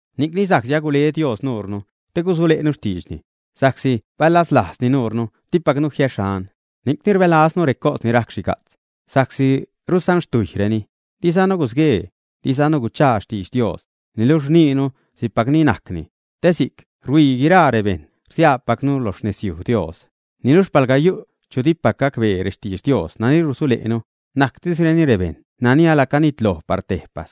Ni'cni sa'csi agule Dios nuure te gusule'nu xtiidxni, sa'csi balaslajzzani nuure, dipacnu jiäxhan. Ni'cni rbälaznu recos ni rajc xhiga'tz, sa'csi rusanxtujyreni. Dizanu gusguee, dizanu guchaa xtidx Dios, niluxh rniinuni si'cpacni najcni, te si'c ruhuii guiraa bejṉ rsiaapacnu lo xnezyuj Dios. Niluxh palga yu' chu dipac gacbee rextidx Dios nani rusule'nu, najctisreni rebejṉ nani ala canitloj par tejpas,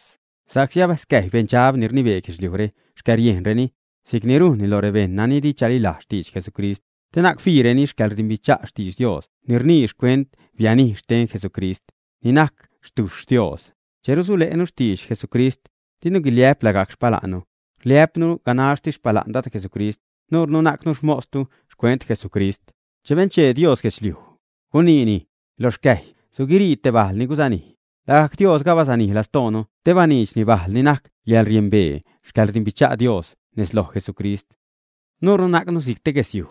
sa'csi abascäjy beṉdxab ni rnibee guedxliujre xcäriejnreni, si'cni rujnni lo rebejṉ nani di chalilajz xtidx Jesucrist, te na'c fiireni xcäḻrdimbicha' xtidx Dios ni rnii xcuent xhanij xten Jesucrist, ni najc xtujxh Dios. Che rusule'nu xtidx Jesucrist, dinu guiliä'p lagajc xpala'nnu, rliä'pnu ganaxtis xpala'n Dad Jesucrist. Nuure najcnu xmostu xcuent Jesucrist. Che benchee Dios guedxliuj, guniini: “Lo xcäjy suguirii te bajl ni gusanij.” Lagajc Diosga abasanij lastoonu te baniidxni bajl ni najc yäḻriembee xcäḻrdimbicha' Dios nez loj Jesucrist. Nuurnu najcnu si'c te guesyuj,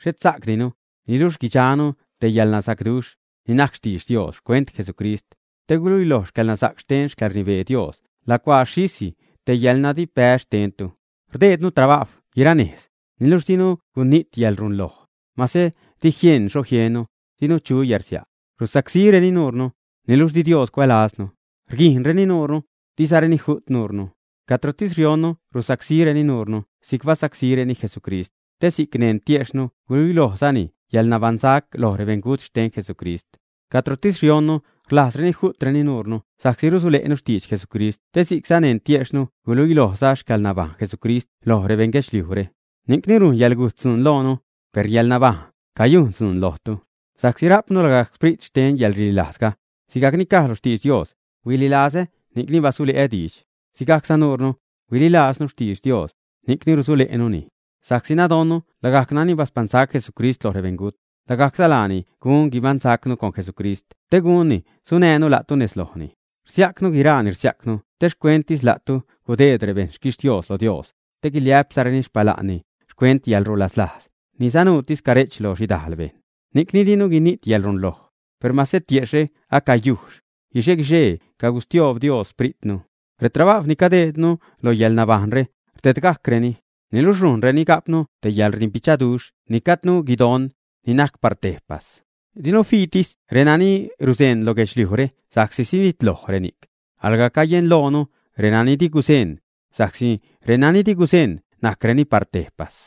xhet sajcdinu, niluxh guidxanu te yäḻnasacduxh, ni najc xtidx Dios xcuent Jesucrist, te guiluiloj xcäḻnasa'c xten xcäḻrnibee Dios lacuaa xhisi te yäḻnadipbäz xtennu. Rdeednu trabajw guira nejz, niluxh dinu gunijt yäḻrunloj. Mase di jieṉ xho jiennu, dinu chu yärsia'. Rusacsíreni nuure, niluxh di Dios cuälaznu, rguijṉreni nuure, dizareni ju't nuure. Cadrotis rionnu rusacsíreni nuure si'c basacsíreni Jesucrist, te si'c neṉ tiejxhnu guluilojzani yäḻnabaṉsac loj rebeṉgut xten Jesucrist. Cadrotis rionnu rlajzreni ju'treni nuure sa'csi rusule'nu xtidx Jesucrist te si'cza neṉ tiejxhnu guluilojzani xcäḻnabajṉ Jesucrist loj rebeṉ guedxliujre. Ni'cni rujn yäḻgujt dzuun loonu, per yäḻnabajṉ cayujn dzuun lojtu. Sa'csi rajpnu lagajc xsprit xten yäḻrililajzga, sigajc ni caj lo xtidx Dios: “Huililazä ni'cni basule'ä diidx.” Sigajcza nuure, huililaaznu xtidx Dios, ni'cni rusule'nuni. Sa'csi nadonnu lagajc nani baspaṉsac Jesucrist loj rebeṉgut, lagajcza laani gun guibaṉsacnu con Jesucrist te gunni sunäjnu la'tu nez lojni. Rsiajcnu guiraa ni rsiajcnu te xcuentsi la'tu gudeedru bejn xquixtios lo Dios, te guiliä'pruzareni xpala'nni xcuent yäḻrulaslajz ni sanuutis care'ch lo xhidajl bejṉ. Ni'cni dinu gunijt yäḻrunloj, per mase tiejxhre acayujxh, guixe-guixee cagustioob Dios spritnu. Retrabajw ni cadeednu lo yäḻnabajṉre rdedgajcreni, niluxh rujnreni ga'pnu te yäḻrdimbichaduxh ni gajdnu guidon, ni najc par tejpas. Dinu fiitis renani ruzeṉ lo guedxliujre sa'csi sinitloj reni'c, alga cayenloonu renani di guzeṉ, sa'csi renani di guzeṉ najcreni par tejpas.